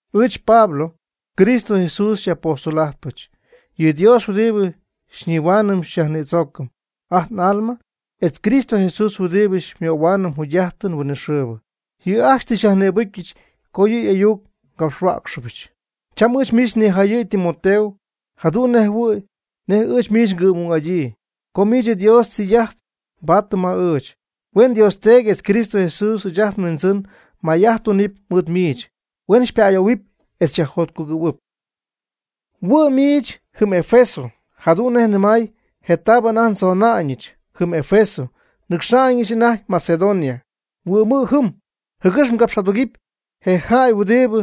Ɨɨch Pablo, Cristo Jesús xyaj'apóstol'ajtpɨch. Yɨ Dios huɨdibɨ xyñihuaanɨm xyyajnïdzoocɨm ajt n'alma, etz Cristo Jesús huɨdibɨ xymöhuaanɨm jugy'ajtɨn huinɨxɨɨbɨ, yɨ' ajcxy tɨ xyajnïbɨcyɨch co yɨ' y'ayuc ngapxhuäcxɨbɨch. Cham ɨɨch miich nijayɨ̈y Timoteo. Jadu'n njɨhuɨ̈y nej ɨɨch miich ngɨ'm'ung'adyii, co miich Dios ytɨy'ajt tɨ mbaady ma ɨɨch. Huen Dios Teedy etz Cristo Jesús ɨɨch ajt nhuindzɨn may'ajt tunɨpy mɨɨd miich, huen xypa'ayoohuɨpy etz xyajjotcugɨ̈huɨpy. Huɨ'mɨ' miich jɨm Efeso, jadu'n nej nɨmay je taabɨ anajty ndzona'ñɨch jɨm Efeso nnɨcxa'ñɨch anajty Macedonia. Huɨ'mɨ' jɨm, jɨgɨx mgapx'adugɨpy je jäy huɨdibɨ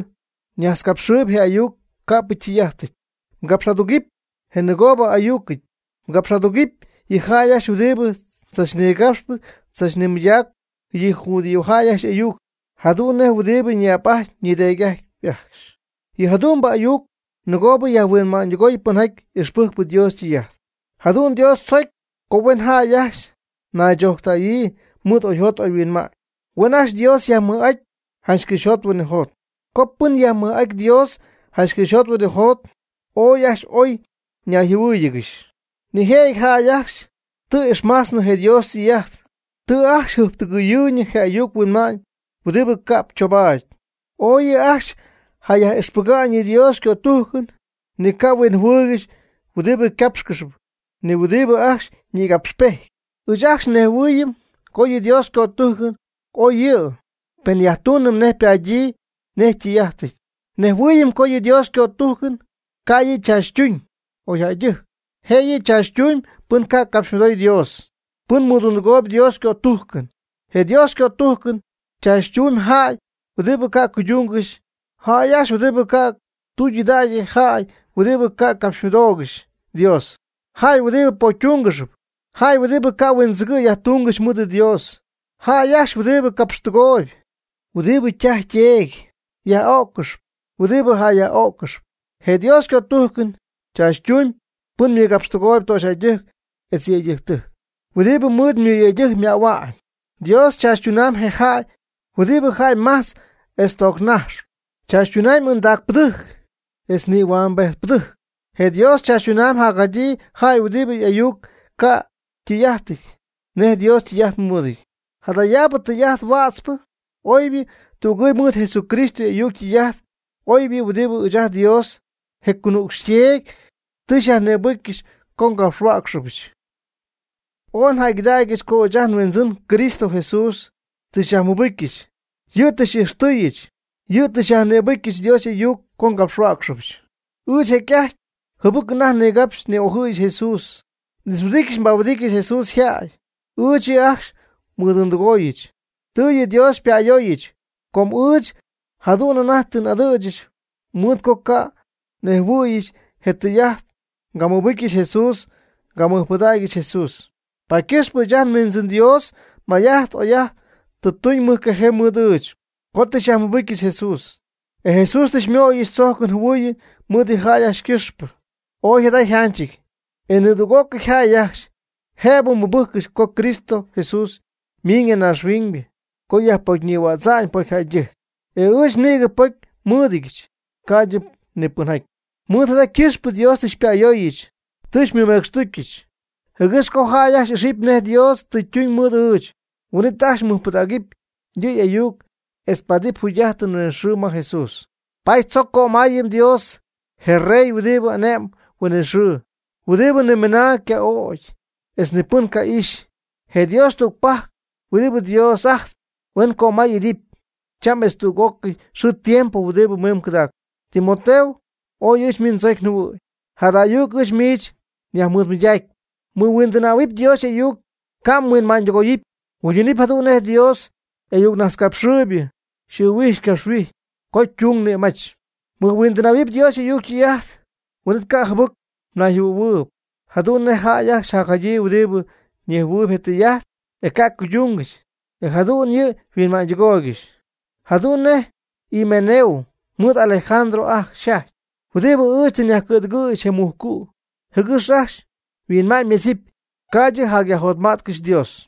najtzcapxɨɨyb je ayuc ca'p ytɨy'ajtɨty. Mgapx'adugɨpy je nɨgoobɨ y'ayucɨty. Mgapx'adugɨpy yɨ' ajcxy huɨdibɨ tzachnigapxp tzachnimɨydacpy yɨ judiojäy ajcxy y'ayuc jadu'n nej huɨdibɨ ñi'ap'ajtpy ñideedy'ajtpy ajcxy. Yɨ jadu'mbɨ ayuc nɨgoob yajhuinma'ñydɨgoy pɨnjaty ixpɨjcp Dios ytɨy'ajt. Jadu'n Dios tzocy co huen jäy ajcxy naychojctäyyii mɨɨd oyjot oyhuinma'ñ. Huen ajcxy Dios yajmɨj'aty janch cɨxyjot huinɨjot. Co pɨn yajmɨj'aty Dios janch cɨxyjot huinɨjot, ooy ajcxy oy ñayjɨhuɨ́ɨyɨgɨxy. Nijëjɨty jäy ajcxy tɨ ixmajtznɨ je Dios ytɨy'ajt, tɨ ajcxy jɨjptɨgɨyɨɨyñɨ je ayuc huinma'ñ huɨdibɨ ca'p choobaady. Ooy yɨ' ajcxy jayaj'ixpɨga'ñ yɨ Dios ycötujcɨn, ni ca' huinjɨhuɨɨygɨxy huɨdibɨ ycapxcɨxyp, ni huɨdibɨ ajcxy ñïgapxpejtpy. Ɨɨch ajcxy nnejhuɨɨyɨm co yɨ Dios ycötujcɨn oy yɨ' pen nyajtunɨm nej ypadyii nej ytɨy'ajtɨty. Nejhuɨɨyɨm co yɨ Dios ycötujcɨn ca' yɨ' tzaachytuñ oyjäydɨjc, jëyɨ tzaachytuñ pɨn ca' capxymɨdoy Dios, pɨn mɨdundɨgooyb Dios ycötujcɨn. Je Dios ycötujcɨn chaachytumyb jäy huɨdibɨ ca' cuydungɨxy, jäy ajcxy huɨdibɨ ca' ytudägyɨty, jäy huɨdibɨ ca' capxymɨdoogɨxy Dios, jäy huɨdibɨ pocytungɨxy, jäy huɨdibɨ ca' huindzɨgɨ'ñ yajtungɨxy mɨɨd Dios, jäy ajcxy huɨdibɨ capxtɨgooyb, huɨdibɨ ytaj yteedy yaj'öccɨxy, huɨdibɨ jäy yaj'öccɨxy. Je Dios ycötujcɨn chaachytumyb pɨn mɨgapxtɨgooyb töxyjäydɨjc etz yëydɨjctɨjc, huɨdibɨ mɨyëydɨjc ymähua'ñ. Dios nañ chaachytumyb je jäy huɨdibɨ jäy majtzp etz toognaxy, chaachytumyb ɨndaacpɨdɨjc etz nïhuambejtpɨdɨjc. Je Dios chaachytumyb jacjadyii jäy huɨdibɨ y'ayuc ca' ytɨy'ajtɨty nej Dios tɨy'ajt mɨɨdɨty. Jadayaabɨ tɨy'ajt huätzpɨ oybɨ tügɨɨyb mɨɨd Jesucristo y'ayuc ytɨy'ajt oybɨ huɨdibɨ ɨɨch nDios, je conuucxy yTeedy, tɨ xyyajnïbɨcyɨch co ngapxhuäcxɨbɨch. Ooy njäygɨdägyɨch co ɨɨch ajt nhuindzɨn Cristo Jesús tɨ xyajmɨcpɨcyɨch, yɨ' tɨ xy'ijxtɨɨyɨch, yɨ' tɨ xyajnïbɨcyɨch Dios y'ayuc co ngapxhuäcxpɨch. Ɨɨch jecy'ajty jɨbɨc anajty nigapxy ni'ojɨɨyɨch Jesús. N'ixhuɨdijty nbahuɨdijtyɨch Jesús yjäy. Ɨɨch yɨ' ajcxy nmɨdundɨgooyɨch. Tɨ yɨ Dios xypa'ayooyɨch com ɨɨch jadu'n anajty tɨ n'adɨ̈ch mɨɨd co nganejhuɨɨyɨch je tɨy'ajt, ngamɨbɨcyɨch Jesús ngamɨjpɨdägyɨch Jesús. Paady ycɨxpɨ ɨɨch ajt nHuindzɨn Dios may'ajt oy'ajt tɨ tuñ mɨjcajee mɨɨd ɨɨch, co tɨ xyajmɨbɨcyɨch Jesús. E Jesús tɨ xymöyɨch tzojcɨn jɨhuɨɨyɨn mɨɨd yɨ' yjäy ycɨxpɨ. Ooy jada yjanchɨty, e nidüg'ócɨy jäy ajcxy jëbɨ mɨbɨjccɨxy co Cristo Jesús miiñ ya naaxhuiñ co yajpocynïhuädza'ñ pocyjäydɨjc. E ɨɨch nïgɨ pocy nmɨ́ɨdɨdyɨch ca'ydɨ ni pɨnjäy. Mɨɨd jada ycɨxpɨ Dios tɨ xypa'ayooyɨch tɨ xymɨmecxtucyɨch, jɨgɨx co jäy ajcxy ijxɨp nej Dios tɨ ytuñ mɨɨd ɨɨch, huin'it ajcxy mɨjpɨdägɨpy yɨ' y'ayuc etz ypaadɨpy jugy'ajtɨn huinɨxɨɨbɨ ma Jesús. Paady chojcpy co ngömayɨm Dios, je rey huɨdibɨ ane'mb huinɨxɨɨ, huɨdibɨ nimɨnaa yca'o'cy, etz nipɨn ca'ixy. Je Dios tügpajc huɨdibɨ Dios'ajtp huen ycömay'idɨpy cham etz tüg'ócɨy xɨɨ tiempo huɨdibɨ mimb cɨdacp. Timoteo, ooy ɨɨch miich ndzocy njɨhuɨ̈y. Jada ayuc ɨɨch miich nyajnɨmaydaayb. Mɨhuindɨnähuɨp Dios y'ayuc ca' mhuinma'ñydɨgoyɨpy. Mguydunɨpy jadu'n nej Dios y'ayucnajtzcapxɨɨybɨ xy'ɨɨhuijy xycapxhuijy co mdung mnïmajch. Mɨhuindɨnähuɨp Dios y'ayuc ytɨy'ajt, huin'it ca' jɨbɨc mnayjɨhuɨ̈huɨɨyb, jadu'n nej ajcxy jadyii huɨdibɨ nejhuɨɨyb je tɨy'ajt, e ca' cuydungɨxy, e jadu'ñyɨ yhuinma'ñydɨgooygɨxy. Jadu'n nej Himeneo mɨɨd Alejandro ajcxy jaty, huɨdibɨ ɨɨch tɨ nyajcɨ̈dɨgɨɨygɨxy je mujcu', jɨgɨx ajcxy yhuinma'ñymedzɨpy, ca'ydɨ yajjotma'tcɨxy Dios.